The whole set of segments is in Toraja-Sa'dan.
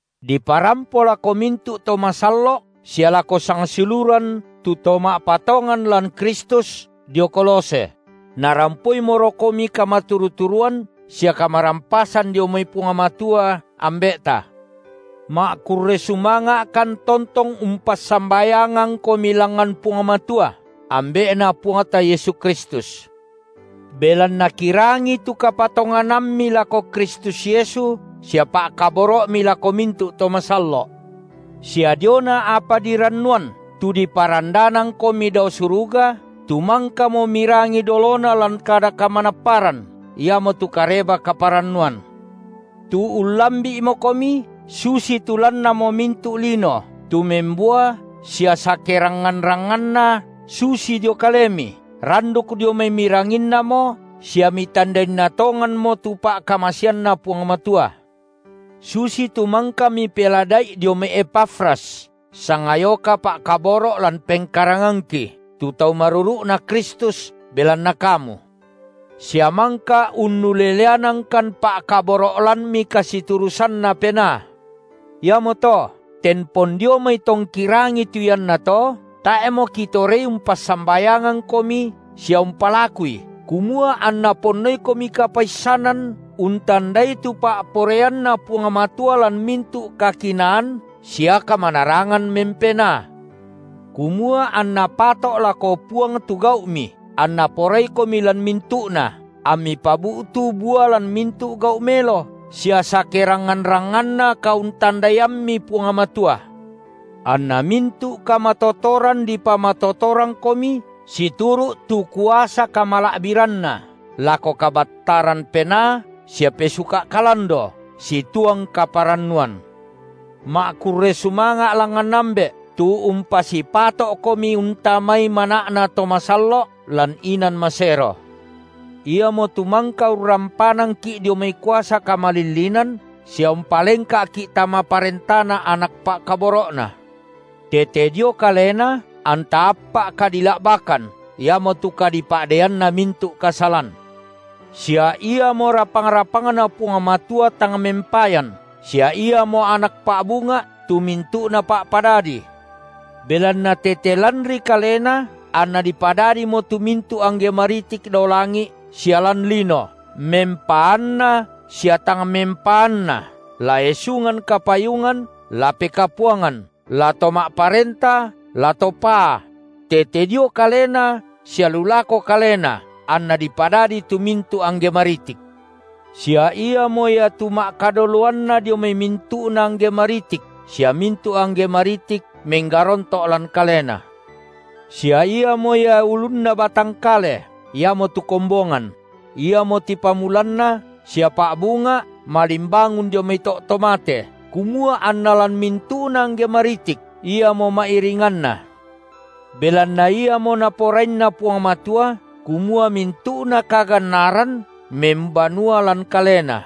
diparampo lako mintu’ to masallo’ sia lako sangsiuluran tu to ma’patongan lan Kristus, dio Kolose: narampoimorokomi kamaturu-turuan sia kamarampasan dio mai Puang Matua, Ambe’ta. Ma’kurre sumanga’kan tontong umpassambayangangkomi langngan Puang Matua, Ambe’Na Puangta Yesu Kristus, belanna kirangi tu kapatonganammi lako Kristus Yesu sia pa’kaboro’mi lako mintu’ to masallo’, sia diona apa dirannuan, tu diparandanangkomi dao suruga, tu mangkamo mirangi dolona lan kada kamanapparan, iamotu Kareba-kaparannuan, tu ullambi’mokomi, susitu lannamo mintu’ lino, tu membua sia sakerangngan-rangnganna, susi dio kalemi, randuk dio mai miranginnamo sia mitandainna tonganmo tu pa’kamaseanNa Puang Matua, susitu mangka mipelada’i dio mai Epafras, sangayoka pa’kaboro’ lan pengkarangangki, tu tau maruru’Na Kristus belanna kamu. Sia mangka unnuleleanangkan pa’kaboro’ lanmi kasiturusanNa Penaa. Iamoto tempon dio mai tongki rangi tu iannato, tae’mo kitorei umpassambayangangkomi sia umpalakui kumua anna ponnoikomi kapaissanan untandai tu pa’poraianNa Puang Matua lan mintu’ kakinaan sia kamanarangan mempenaa, kumua anna pato’ lako Puang tu gau’mi, anNa poraikomi lan mintu’na, ammi pabu’tu bua lan mintu’ gau’ melo, sia sakerangngan-rangnganna kauntandaiammi Puang Matua. Anna mintu’ kamatotoran dipamatotorangkomi situru’ tu kuasa kamala’biranNa lako kabattaran penaa sia pesuka’ kalando situang kaparannuan, ma’kurre sumanga’ langngan Ambe’, tu umpasipato’komi untamai mana’na to masallo’ lan inan masero. Iamotu mangka urrampanangki’ dio mai kuasa kamalillinan sia umpalengka’ki tama parentaNa Anak pa’kaboro’Na, tete dio Kalena anta appa’ kadila’bakan, iamotu kadipa’deianna mintu’ kasalan, sia Iamo rapang-rapangNa Puang Matua tang mempayan, sia Iamo Anak pa’bunga’ tu mintu’na pa’padadi, belanna tete lanri Kalena anna dipadadimo tu mintu’ angge maritik dao langi’ sia lan lino, mempaanna sia tang mempaanna, la esungan kapayungan, la pekapuangan, la to ma’parenta, la to paa; tete dio Kalena sia lu lako Kalena anna dipadadi tu mintu’ angge maritik; sia Iamo Ia tu ma’kadoloanna dio mai mintu’na angge maritik, sia mintu’ angge maritik menggaronto’ lan Kalena; sia Iamo Ia ulunna batang kale, iamotu kombongan; Iamo tipamulanna sia pa’bunga’ malimbangun dio mai to’ to mate, kumua anna lan mintu’na angge maritik Iamo ma’iringanna. Belanna Iamo Naporaianna Puang Matua, kumua mintu’ kagannaran membanua lan Kalena.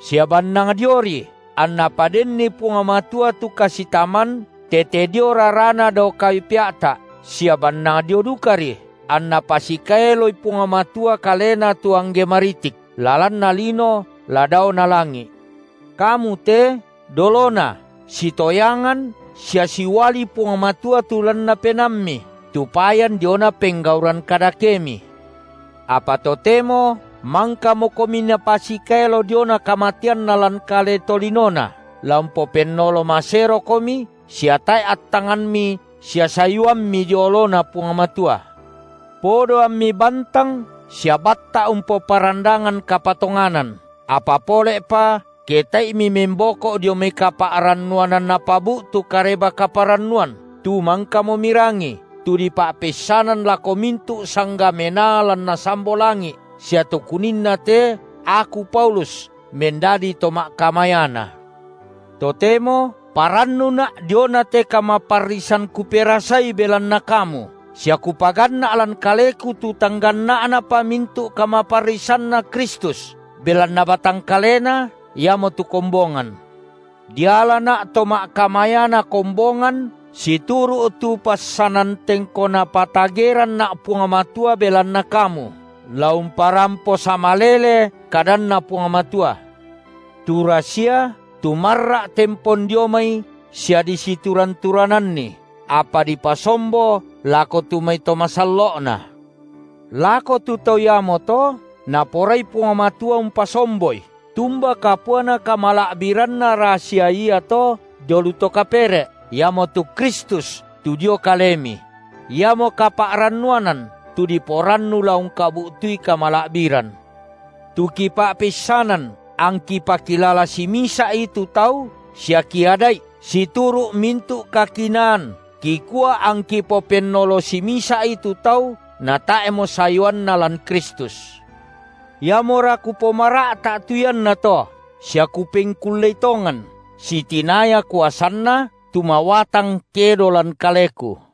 Sia bannang dioRi anNa padenni Puang Matua tu kasitaman tete dio raraNa dao kayu pea’ta’, sia bannang dio dukaRi anNa pasikaeloi Puang Matua Kalena tu angge maritik, la lanna lino la daona langi’. Kamu te dolona sitoyangan sia siuali Puang Matua tu lanna penaammi, tu payan diona penggauran kadakemi, apa totemo mangkamokomi Napasikaelo diona kamateanNa lan kale tolinoNa, la umpopennolo maserokomi sia tae’ attanganmi sia sayuammi dio oloNa Puang Matua, podo ammi bantang sia batta’ umpoparandangan kapatonganan, apa pole’pa, ke tae’i mimemboko’ dio mai kapa’rannuanan napabu’tu Kareba-kaparannuan, tu mangkamo mirangi, tu dipa’peissanan lako mintu’ sangga menaa lan nasambo langi’ sia tu kuninna te aku Paulus mendadi to ma’kamayana. Totemo parannuna’ diona te kamaparrisan kuperasai belanna kamu, sia kupaganna’ lan kaleku tu tang ganna’na pa mintu’ kamaparrisanNa Kristus, belanna batang kaleNa, iamotu kombongan. Dialana’ to ma’kamayana kombongan situru’ tu passanan tengko Napatageranna’ Puang Matua belanna kamu, la umparampo sama lele kadanNa Puang Matua, tu rasia tu marra’ tempon dio mai sia disituran-turananni, apa dipasombo lako tu mai to masallo’Na. Lako tu tau iamoto Naporai Puang Matua umpasomboi, tumba kapuana kamala’biranna rasia iato dio lu to kapere’, iamotu Kristus tu dio kalemi; Iamo kapa’rannuanan, tu diporannu la ungkabu’tui kamala’biran, tu kipa’peissanan, angki pakilala simisa’i tu tau sia kiada’i situru’ mintu’ kakinaan, kikua angki popennolo simisa’i tu tau natae’mo sayuanna lan Kristus. Iamora kupomara’ta’ tu iannato, sia kupengkullei tongan, sitinaya kuasanNa, tu mawatang kedo lan kaleku.